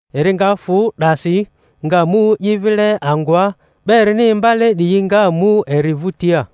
Eri nga fᴜ 'dasi, nga mu i vile angᴜa; 'ba erini imbale 'diyi nga mu eri vᴜtia.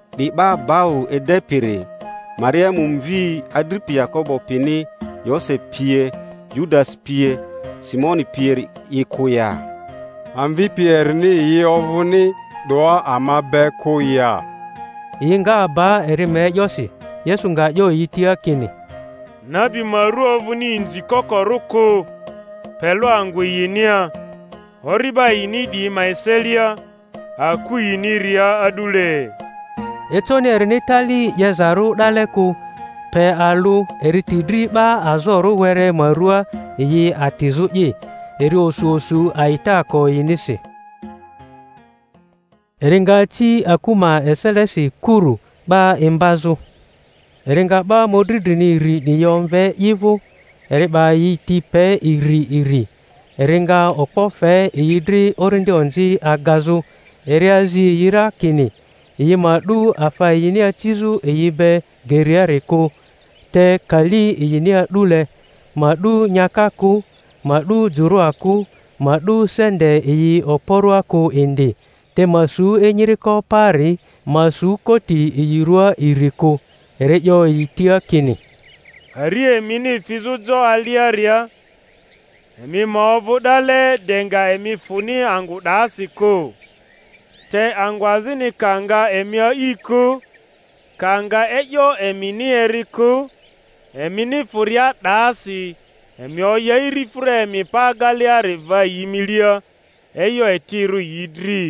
'Di 'ba bau edepiri, Mariamu mvi, adripi Yakobo pini Yose pie Yudasi pie Simoni pieri'i kᴜ ya? Amvipi erini yi ovᴜni 'doa ama be kᴜ ya? Yi nga aba eri ma e'yosi. Yesu nga 'yo yi tia kini, Nabi ma rᴜ ovᴜni inzikokorᴜ kᴜ, pe lᴜ angᴜ yinia, ori'ba yini 'diyi ma eselia, aku yiniria a'dule. Econi erini tali 'yezarᴜ 'dale kᴜ, pe alᴜ eri ti dri 'ba azorᴜ were ma ruaa yi atizᴜ'i. Eri osu osu a'itaako yinisi. Eri nga aci aku ma eselesi kuru, 'ba imbazᴜ. Eri nga 'ba mᴜdri drini iri 'diyi omve i vᴜ, eri 'ba yi ti pe iri iri, ari nga okpo fe yi dri orindi onzi agazᴜ. Eri azi yi ra kini yi ma 'du afa yini acizᴜ yi be geriari kᴜ, te kali yini a'dule; ma 'du nyaka kᴜ, ma 'du jᴜrᴜa kᴜ, ma 'du sente yi oporoa kᴜ indi; te ma su enyiriko paari, ma su koti yi rᴜaa iri kᴜ. Eri 'yo yi tia kini, Pari emini fizᴜ jo aliaria, emi ma ovᴜ 'dale de nga emi fᴜni angᴜ 'dasi kᴜ. Te angᴜ azini ka nga emi a'i kᴜ, ka nga e'yo emini eri kᴜ, emini fᴜria 'dasi emi oya irifᴜra emi pa ageleari va yi milia, e'yo etirᴜ yi dri.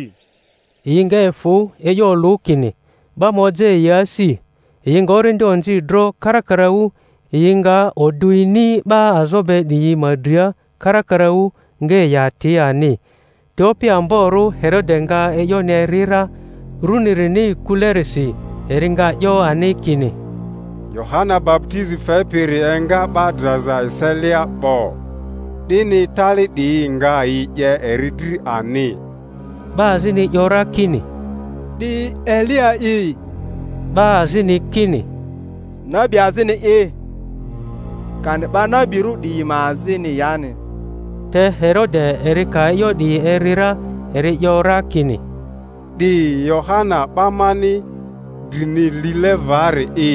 Yi nga efᴜ e'yo olᴜ, kini 'ba ma oja yi asi. Yi nga orindi onzi dro karakaraᴜ, yi nga odᴜ ini 'ba azo be 'diyi ma dria karakaraᴜ, nga yi ati ani. Te opi amborᴜ Herode nga e'yoni eri ra, runirini kulerisi. Eri nga 'yo ani kini, Yohana baputizi fepiri enga 'ba draza eselia 'bo; 'dini tali 'diyi nga yi 'ye eri dri ani. 'Ba azini 'yo ra kini, 'Di Eliya'i. 'Ba azini kini, Nabi azini'i, kani 'ba nabirᴜ 'diyi ma azini yani. Te Herode eri ka e'yo 'di eri ra, eri 'yo ra kini, 'Di Yohana 'ba mani drini lile vari'i,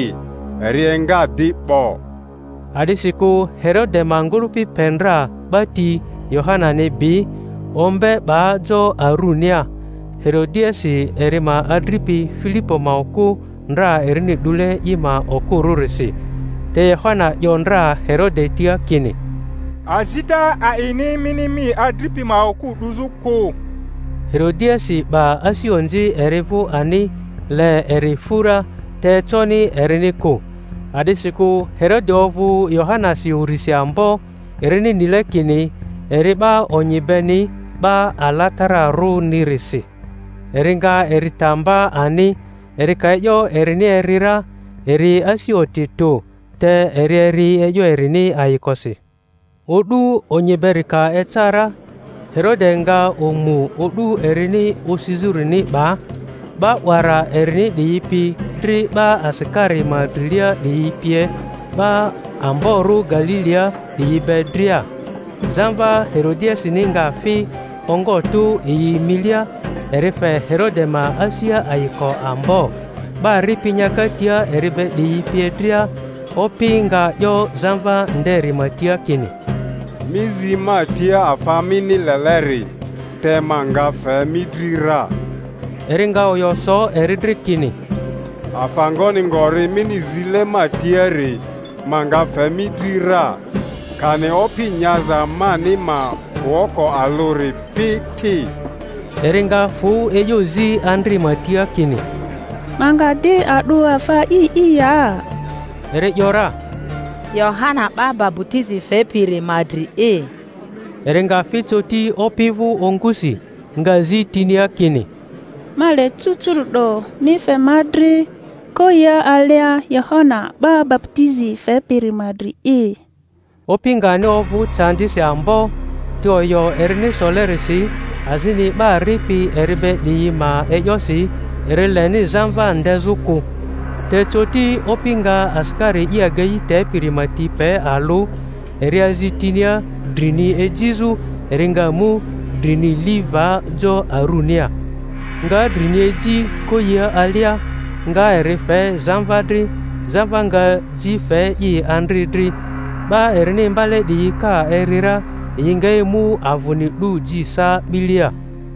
eri enga di 'bo. A'disikᴜ Herode ma ngᴜlᴜpi pe ndra 'ba ti Yohanani bi, ombe, 'ba jo arunia, Herodiasi eri ma adripi Filipo ma okᴜ ndra erini 'dule i ma okᴜrᴜrisi. Te Yohana 'yo ndra Herode tia kini, Azita a'ini mini mi adripi ma okᴜ 'duzᴜ kᴜ. Herodiasi 'ba asi onzi eri vᴜ ani, le eri fᴜ ra. Te econi erini kᴜ, a'disikᴜ Herode ovᴜ Yohanasi urisi ambo, erini nile kini eri 'ba onyi beni, 'ba alatararᴜnirisi; eri nga eri ta mba ani. Eri ka e'yo erini eri ra, eri asi oti tᴜ; te eri eri e'yo erini ayikosi. O'du onyi beri ka eca ra, Herode nga omu o'du erini osizᴜrini 'ba, 'ba 'wara erini 'diyi pi dri 'ba asikari ma drilia 'diyi pie, 'ba amborᴜ Galilia 'diyi be dria. Zamva Herodiasini nga fi ongo tᴜ yi milia, eri fe Herode ma asia ayiko ambo, 'ba ripi nyaka tia eri be 'diyi pie dria; opi nga 'yo zamva nderi ma tia kini, Mi zi ma tia afa mini leleri, te ma nga fe mi dri ra. Eri nga oyo so eri dri kini, Afa ngoni ngori mini zile ma tiari, ma nga fe mi dri ra, kani opi nyaza mani ma woko alᴜri pi ti. Eri nga fᴜ e'yo zi andri ma tia kini, Ma nga di a'dᴜ afa a'i'i ya? Eri ‘yora, Yohana 'ba baputizi fepiri ma dri'i. Eri nga fi coti opi vᴜ ongusi, nga zi tinia kini, Ma le cucuru’do mi fe ma dri koyia alia Yohana 'ba baputizi fepiri ma dri'i. Opi nga ani ovᴜ candisi ambo; te oyo erini solerisi, azini 'ba ripi eri be 'diyi ma e'yosi, eri leni zamva ndezᴜ kᴜ. Te coti opi nga asikari i agei tepiri ma ti pe alᴜ, eri azi tinia drini ejizᴜ. Eri nga mu drini li va jo arunia, nga drini eji koyia alia, nga eri fe zamva dri; zamva nga ji fe i andri dri. 'Ba erini imbale 'diyi ka eri ra, yi nga emu avᴜni 'du ji sa 'bilea.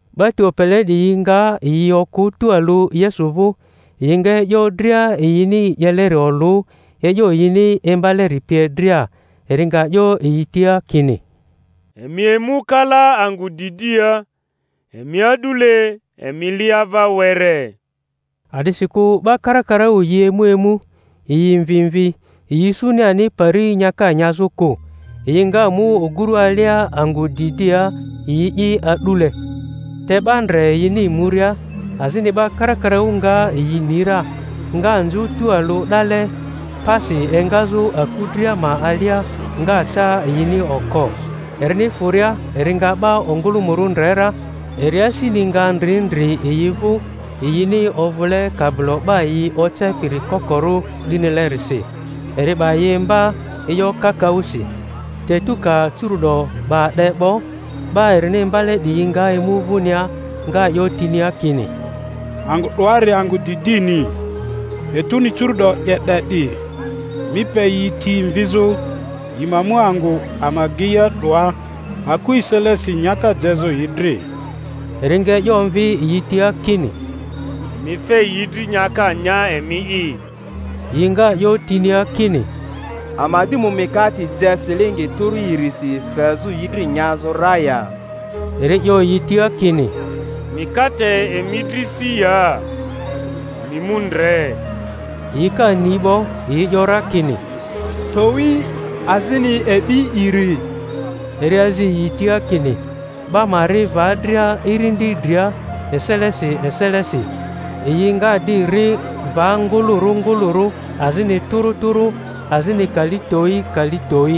'Ba ti opele 'diyi nga yi okᴜ tualᴜ Yesu vᴜ, yi nga e'yo dria yini 'yeleri olᴜ, e'yo yini imbaleri pie dria. Eri nga 'yo yi tia kini, Emi emu kalaa angᴜ didia, emi a'dule, emi li ava were. A'disikᴜ 'ba karakaraᴜ yi emu emu, yi mvi mvi, yi isuni ani pari nyaka nyazᴜ kᴜ. Yi nga mu oguru alia angᴜ didia, yi'i a'dule. Te 'ba ndre yini muria, azini 'ba karakaraᴜ nga yi ni ra, nga nzᴜ tualᴜ 'dale pasi engazᴜ aku dria ma alia, nga ca yini oko. Erini fᴜria eri nga 'ba ongᴜlᴜmᴜrᴜ ndre ra, eri asini nga ndri ndri yi vᴜ, ymi ovᴜle kabilo 'ba yi ocepiri kokorᴜ 'dinilerisi; eri 'ba yi imba e'yo kakaᴜsi. Te etu ka curu’do 'ba 'de 'bo, 'ba erini imbale 'diyi nga emu vᴜnia, nga 'yo tinia kini, Angᴜ 'doari angᴜ didini, etuni curu'do 'ye 'de 'di; mi pe yi ti mvizᴜ, yi ma mu angᴜ ama ageia 'doa aku eselesi nyaka jezᴜ yi dri. Eri nga e'yo omvi yi tia kini, Emi fe yi dri nyaka nya emi'i. Yi nga 'yo tinia kini, Ama di mu mikate je silingi tᴜrᴜ irisi fezᴜ yi dri nyazᴜ ra ya? Eri 'yo yi tia kini, Mikate emi dri si ya? Emi mu ndre. Yi ka ni 'bo, yi 'yo ra kini, Towi, azini e'bi iri. Eri azi yi tia, kini 'ba ma ri va dria irindi dria eselesi eselesi. Yi nga di ri va ngᴜlᴜrᴜ ngᴜlᴜrᴜ, azini tᴜrᴜ tᴜrᴜ, azini kali towi kali towi.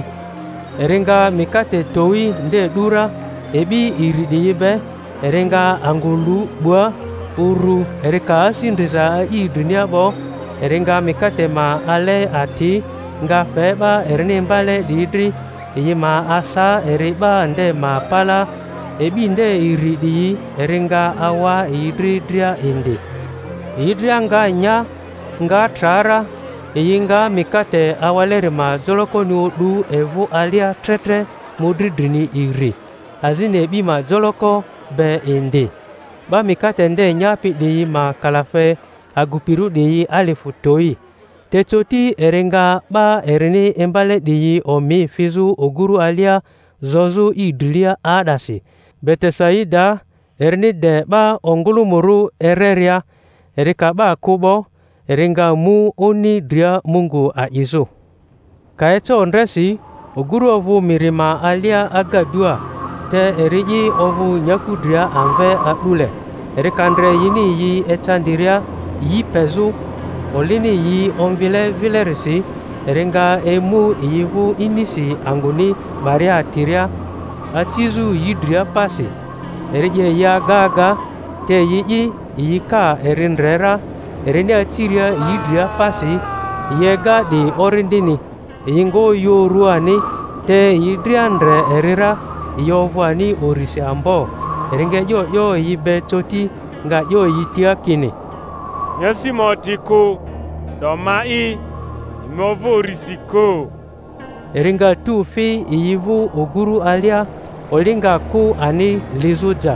Eri nga mikate towi nde 'du ra e'bi iri 'diyi be, eri nga angᴜ lᴜ 'bna uru, eri ka asi ndriza a'i drinia 'bo, eri nga mikate ma a ale ati, nga fe 'ba erini imbale 'diyi dri, yi ma asa eri 'ba nde ma palaa; e'bi nde iri 'diyi eri nga awa yi dri dria indi. Yi dria nga nya, nga tra ra. Yi nga mikate awaleri ma jolokoni o'du evᴜ alia tre tre mᴜdri drini iri, azini e'bi ma joloko be indi. 'Ba mikate nde nyapi 'diyi ma kalafe, agupirᴜ 'diyi alifᴜ towi. Te coti eri nga 'ba erini imbale 'diyi omi fizᴜ oguru alia zozᴜ i drilia 'aa'dasi Betesaidaa, erini de 'ba ongᴜlᴜmᴜrᴜ ereria. Eri ka 'ba kᴜ 'bo, eri nga mu oni dria Mungu a'izᴜ. Ka eca ondresi, oguru ovᴜ miri ma alia agadua, te eri'i ovᴜ nyaku dria amve a'dule. Eri ka ndre yini yi ecandiria yi pezᴜ, olini yi omvlie vilerisi, eri nga emu yi vᴜ inisi angᴜni 'baria atiria, acizᴜ yi dria pasi. Eri 'ye yi aga aga, te yi'i yi ka eri ndre ra erini aciria yi dria pasi, yi ega 'di orindini, yi nga oyᴜ uru ani; te yi dria ndre eri ra, yi ovᴜ ani urisi ambo. Eri nga e'yo 'yo yi be coti, nga 'yo yi tia kini, Emi asi ma oti kᴜ, 'do ma’i; emi ovᴜ urisi kᴜ. Eri nga tu fi yi vᴜ oguru alia, oli nga kᴜ ani lizᴜ ja;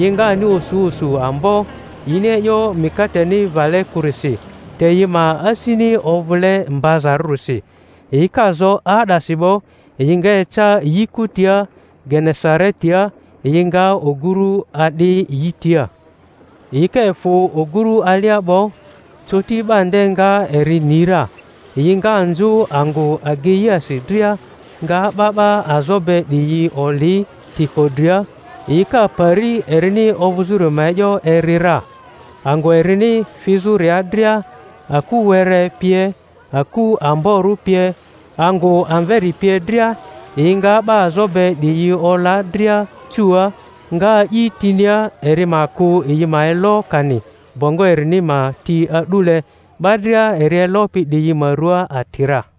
yi nga ani osu osu ambo; yini e'yo mikateni vale kurisi, te yi ma asini ovᴜle mbazarᴜrisi. Yi ka zo 'aa'dasi 'bo, yi nga eca yi kutia Genesaretia, yi nga oguru a'di yi tia. Yi ka efᴜ oguru alia 'bo, coti 'ba nde nga eri ni ra, yi nga nzᴜ angᴜ ageiasi dria, nga 'ba 'ba azo be 'diyi oli tiko dria, yi ka pari erini ovᴜzᴜri ma e'yo eri ra. Angᴜ erini fizᴜria dria, aku were pie, aku amborᴜ pie, angᴜ amveri pie dria, yi nga 'ba azo be 'diyi ola dria cuua, nga a'i tinia eri ma kᴜ yi ma elo kani bongo erini ma ti a'dule; 'ba dria eri elopi 'diyi ma rua ati ra.